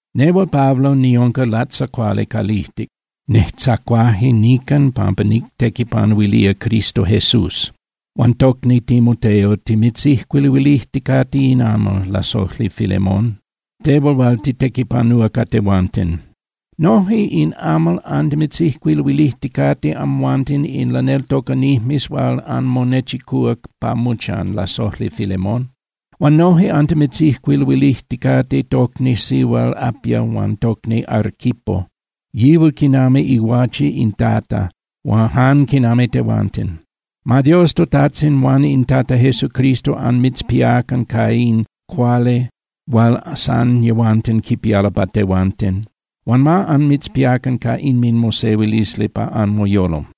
Nehual Pablo niunca latzacuali calijtic, nejtzacuaje nican pampa nictequipanuilía Cristo Jesús. Huan tocni Timoteo timitzijcuiluilijticate in amal, lasojli Filemón, tehual hual titequipanúa ca tehuanten. Noje in amal antimitzijcuiluilijticate amhuanten in laneltocanijmes hual anmonechicúa pa mochan, lasojli Filemón. Huan noje antimitzijcuiluilijticate tocni sihual Apia huan tocni Arquipo, yihual quinami iguache in Tata jan quinami tehuanten. Ma Dios toTajtzin huan in Tata Jesucristo anmitzpiacan ca in cuali hual san yehuanten quipialo pa tehuanten. Huan ma anmitzpiacan ca inminmosehuilisli pa anmoyolo.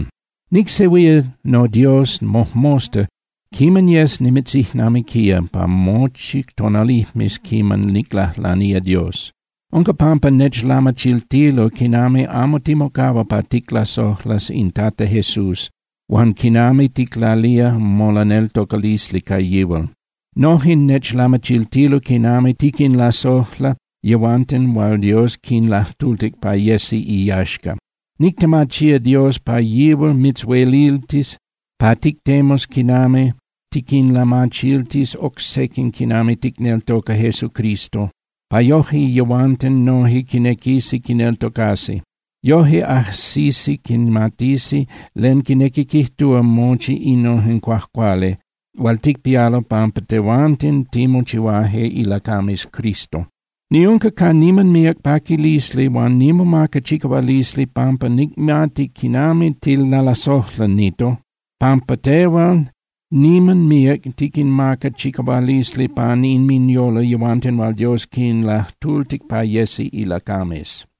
Nicsehuía noDios mojmosta quiman yes nimitzijnamiquía pa mochi tonalijmes quiman niclajlanía Dios. Unca pampa nechlamachiltilo quinami amo timocahua pa ticlasojlas in Tata Jesús huan quinami ticlalía molaneltocalisli ca yihual. Noje nechlamachiltilo quinami tiquinlasojla yehuanten hual Dios quinlajtultic pa yesi iyaxca. Nictemachía Dios pa yihual mitzhueliltis pa tictemus quinami tiquinlamachiltis oc sequin quinami ticneltoca Jesucristo, pa yoje yehuanten noje quinequisi quineltocasi. Yoje ajsisi quimatisi len quinequi quijtúa mochi innojen cuajcuali hual ticpialo pampa tehuanten timochihuaje ilacames Cristo. Niunca ca niman míac paquilisli huan nimomaca chicahualisli pampa nicmati quinami tilalasojla, Nito, pampa tehual niman miac tiquinmaca chicahualisli pan inminyolo yehuanten hual Dios quinlajtultic pa yesi ilacames.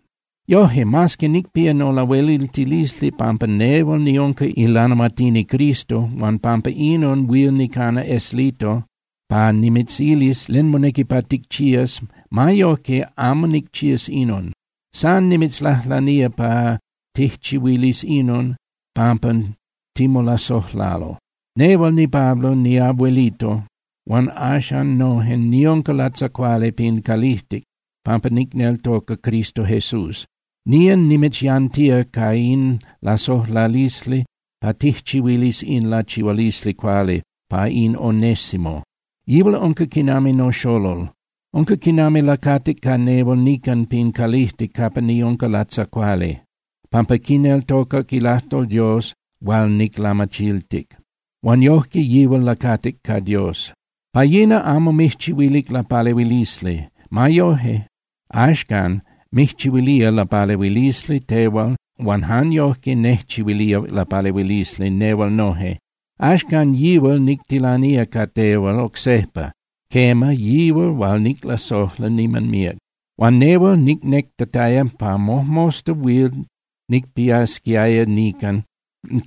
Yoje, mas que nicpía nolahueliltilisli pampa nehual niunca ilanahuatini Cristo huan pampa inon huil nicana eslito pa nimitzilis len monequi pa ticchías, ma yojque, amo nicchías inon. San nimitzlajlanía pa tijchihuilis inon pampa timolasojlalo. Nehual niPablo niabuelito hual axan noje niunca latzacuali pin calijtic pampa nicneltoca Cristo Jesús, nía nimitzyantía ca in lasojlalisli pa tijchihuilis in lachihualisli cuali pa in Onésimo. Yihual unca quinami noxolol. Unca quinami lacatic ca nehual nican pin calijtic capa niunca latzacuali, pampa quineltocac ilajtol Dios hual niclamachiltic. Huan yojque yihual lacatic ca Dios. Pa yina, amo mijchihuilic lapalehuilisli. Ma yoje, axcan mijchihuilía lapalehuilisli tehual huan jan yojque nejchihuilía lapalehuilisli nehual noje. Axcan yihual nictilanía ca tehual oc sejpa, quema, yihual, hual niclasojla niman míac. Huan nehual nicnectataya pa mojmosta huil nicpiasquiaya nican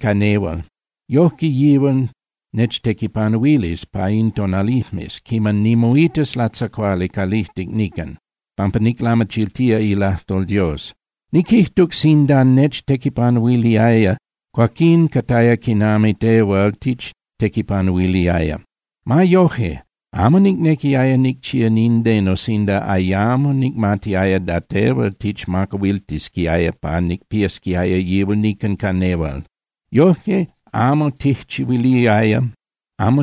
ca nehual. Yojque yihual nechtequipanuilis pa in tonalijmes quiman nimoitas latzacuali calijtic nican, pampa niclamachiltía ilajtol Dios. Niquijtuc sinda nechtequipanuiliaya, cuaquín cataya quinami tehual tichtequipanuiliaya. Ma yoje, amo nicnequiaya nicchía nindeno sinda ayamo nicmatiaya da tehual tichmacahuiltisquiaya pa nicpiasquiaya yihual nican ca nehual. Yojque amo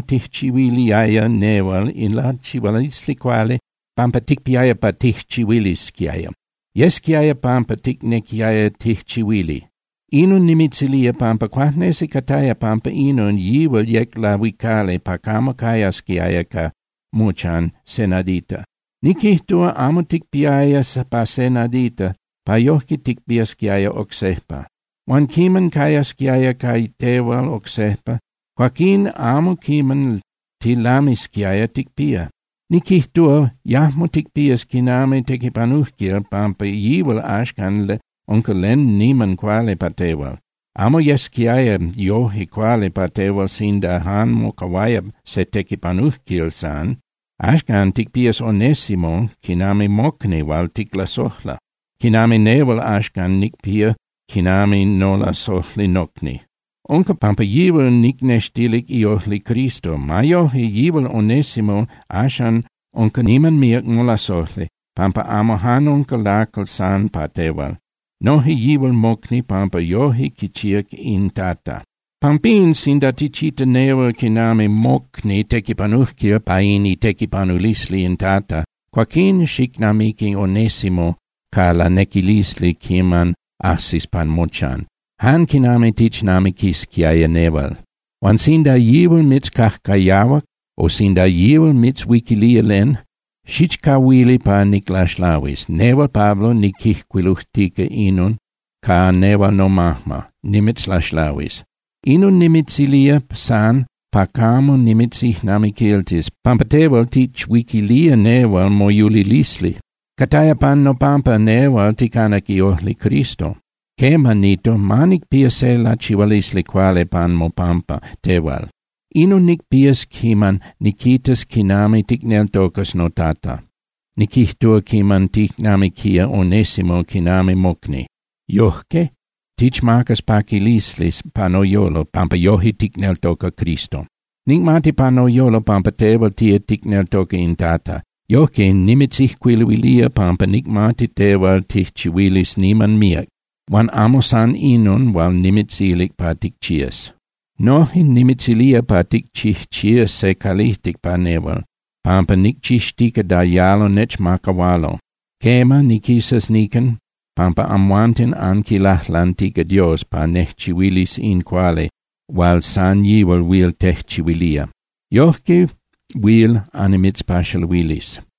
tijchihuiliaya nehual in lachihualisli cuali pampa ticpiaya pa tijchihuilisquiaya. Yesquiaya pampa ticnequiaya tijchihuili. Inon nimitzilía pampa cuajnesi cataya pampa inon yihual yec lahuicali pa camo cayasquiaya pa mochan se nadita. Niquijtúa, amo ticpiaya pa se nadita pa yojque ticpiasquiaya oc sejpa. Huan quiman cayasquiaya ca tehual oc sejpa, cuaquín amo quiman tilamisquiaya ticpía. Niquijtúa, yajmo ticpías quinami tequipanujquil pampa yihual axcan unca len niman cuali pa tehual. Amo yesquiaya yoje cuali pa tehual sinda jan mocahuaya se tequipanujquil san. Axcan ticpías Onésimo quinami mocni hual ticlasojla, quinami nehual axcan nicpía quinami nolasojli nocni. Unca pampa yihual nicnextilic iojli Cristo. Ma yoje, yihual Onésimo axan unca niman míac molasojli, pampa amo jan unca lacal san pa tehual. Noje yihual mocni pampa yoje quichíac in Tata. Pampín, sinda tichita nehual quinami mocni tequipanujquil pa in itequipanulisli in Tata, cuaquín xicnamiqui Onésimo ca lanequilisli quiman ajsis pa mochan, jan quinami tichnamiquisquiaya nehual. Huan sinda yihual mitzcajcayahuac o sinda yihual mitzhuiquilía len, xichcahuili pa niclaxlahuis. Nehual Pablo niquijcuilujtica inon ca nehual nomajma, nimitzlaxlahuis. Inon nimitzilía san pa camo nimitzijnamiquiltis pampa tehual tichuiquilía nehual moyulilisli. Cataya pan nopampa nehual ticanac iojli Cristo. Quema, Nito, ma nicpía se lachihualisli cuali pan mopampa tehual. Inon nicpías quiman niquitas quinami ticneltocas toTata, niquijtúa, quiman ticnamiquía Onésimo quinami mocni. Yojque tichmacas paquilisli pa noyolo pampa yoje ticneltoca Cristo. Nicmati pa noyolo pampa tehual tía ticneltoca in Tata. Yojque, nimitzijcuiluilía pampa nicmati tehual tijchihuilis niman míac, huan amo san inon hual nimitzilic pa ticchías. Noje nimitzilía pa ticchijchías se calijtic pa nehual, pampa nicchixtica da yalo nechmacahualo. Quema, niquisas nican pampa amhuanten anquilajlantica Dios pa nejchihuilis in cuali hual san yihual huil tejchihuilía. Yojque huil annimitzpaxaluilis.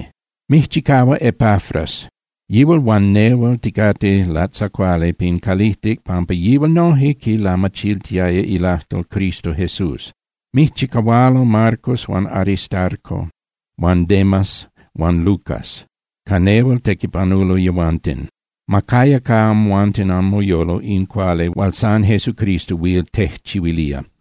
Mijchicahua Epafras, yihual huan nehual ticate latzacuali pin calijtic pampa yihual noje quilamachiltiaya ilajtol Cristo Jesús. Mijchicahualo Marcos huan Aristarco huan Demas huan Lucas, ca nehual tequipanulo yehuanten. Ma caya ca amhuanten anmoyolo in cuali hual san Jesucristo huil tejchihuilía.